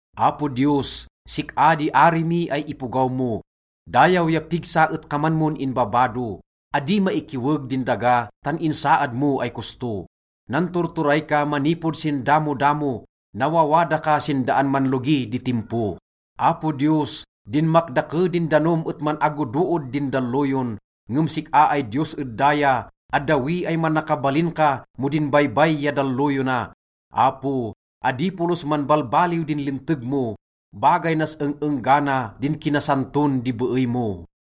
Apo Diyos, sik-a di ari mi ay ipogaw mo, dayaw ya pigsa et kaman mon inbabado. Adi maikiweg din daga tan insaad mo ay kosto. Nanturturay ka manipod sin damodamo, nawawada ka sin daan manlogi di timpo. Apo Diyos, dinmakdake din danom et man-agodood din dalloyon. Ngem sik-a ay Diyos ed daya, addawi ay manakabalin ka mo din baybay ya dalloyona. Apo, adi polos manbalbaliw din linteg mo. Bagay nas eng-enggana din kinasanton di beey mo.